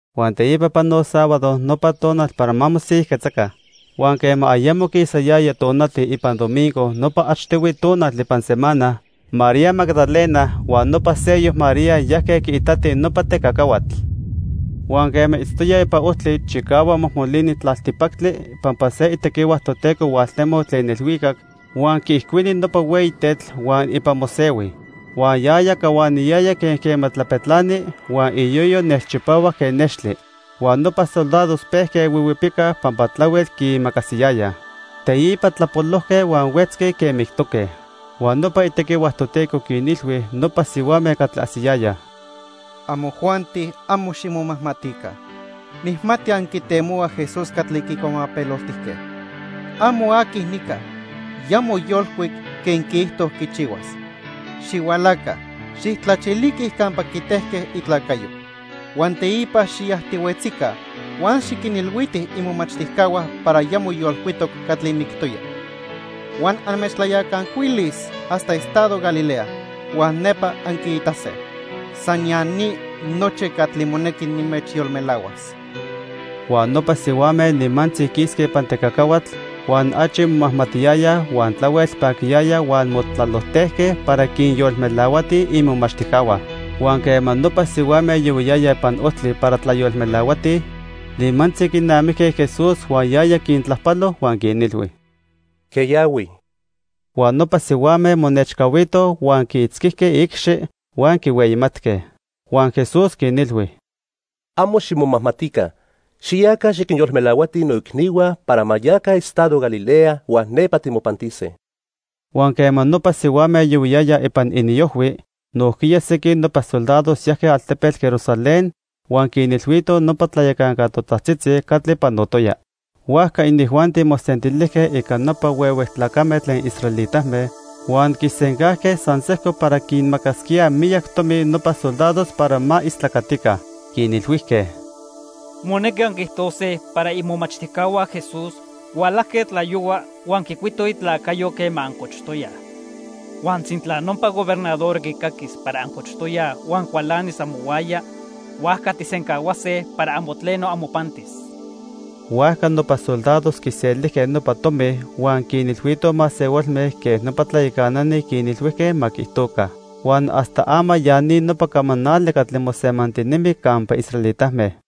Huan teipa panoc sábado, nopa tonal para ma mosiyajquetzaca. Huan quema ayamo quisayaya tonati ipan domingo nopa achtihui tonal ipan semana, María Magdalena huan nopa seyoc María yajque quiitatij nopa tecacahuatl. Huan quema itztoyaj ipan ojtli, chicahuac mojmolini tlaltipactli pampa se itequihua Toteco hualtemoc tlen ilhuicac, huan quiijcuini nopa hueyi tetl huan ipan mosehui. Huan yaya cahuaniyaya quen quema tlapetlani, huan iyoyo nelchipahuac quen nextli. Huan nopa soldados pejque huihuipicaj pampa tlahuel quiimacasiyayaj. Teipa tlapolojque huan huetzque quen mictoque. Huan nopa itequihua Toteco quinilhui nopa sihuame catli ajsiyayaj: —Amojuanti amo ximomajmatica. Nijmati anquitemohuaj Jesús catli quicuamapeloltijque. Amo aqui nica. Ya moyolcuic quen quiijto quichihuas. Xihualaca, xijtlachiliquij campa quitejque itlacayo. Huan teipa xiyajtihuetzica huan xiquinilhuitij imomachtijcahua para ya moyolcuitoc catli mictoya. Huan anmechtlayacancuilis hasta estado Galilea huan nepa anquiitase. San ya ni nochi catli monequi nimechyolmelahuas. Huan nopa sihuame nimantzi quisque ipan tecacahuatl huan achi momajmatiyayaj huan tlahuel paquiyayaj huan motlalojtejque para quinyolmelahuatij imomachtijcahua. Huan quema nopa sihuame yohuiyayaj ipan ojtli para tlayolmelahuatij, nimantzi quinamijque Jesús huan yaya quintlajpalo huan quinilhui: —Queyahui. Huan nopa sihuame monechcahuitoj huan quiitzquijque iicxi huan quihueyimatque. Huan Jesús quinilhui: —Amo ximomajmatica. Xiyaca, xiquinyolmelahuatij noicnihua para ma yaca estado Galilea huan nepa timopantise. Huan quema nopa sihuame yohuiyayaj ipan iniojhui, nojquiya sequin nopa soldados yajque altepetl Jerusalén huan quinilhuitoj nopa tlayacanca totajtzitzi catli panotoya. Huajca inijuanti mosentilijque ica nopa huehue tlacame tlen israelitame huan quisencajque san sejco para quinmacasquíaj miyac tomi nopa soldados para ma istlacatica. Quinilhuijque: —Monequi anquiijtose para imomachtijcahua Jesús hualajque tlayohua huan quicuitoj itlacayo quema ancochtoyaj. Huan sintla nopa gobernador quicaquis para ancochtoyaj huan cualanis amohuaya, huajca tijsencahuase para amo tleno amopantis. Huajca nopa soldados quiselijque nopa tomi huan quinilhuitoj masehualme quen nopa tlayacanani quinilhuijque ma quiijtoca. Huan hasta ama ya ni nopa camanali catli mosemantinemi campa israelitame.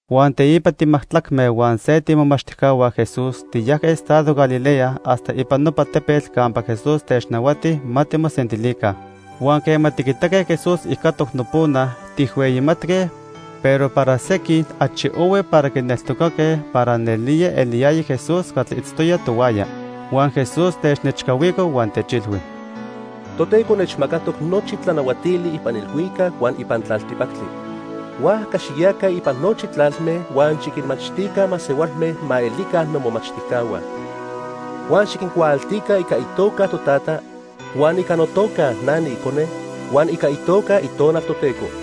Huan teipa timajtlacme huan se tiimomachtijcahua Jesús tiyajque estado Galilea hasta ipan nopa tepetl campa Jesús technahuati ma timosentilica. Huan quema tiquitaque Jesús ijcatoc nopona, tijhueyimatque, pero para sequin achi ohui para quineltocaque para nelía eliyaya Jesús catli itztoya tohuaya. Huan Jesús technechcahuico huan techilhui: —Toteco nechmacatoc nochi tlanahuatili ipan ilhuicac huan ipan tlaltipactli. Huajca xiyaca ipan nochi tlalme huan xiquinmachtica masehualme ma elica nomomachtijcahua. Huan xiquincuaaltica ica itoca Totata, huan ica notoca Itonal Toteco.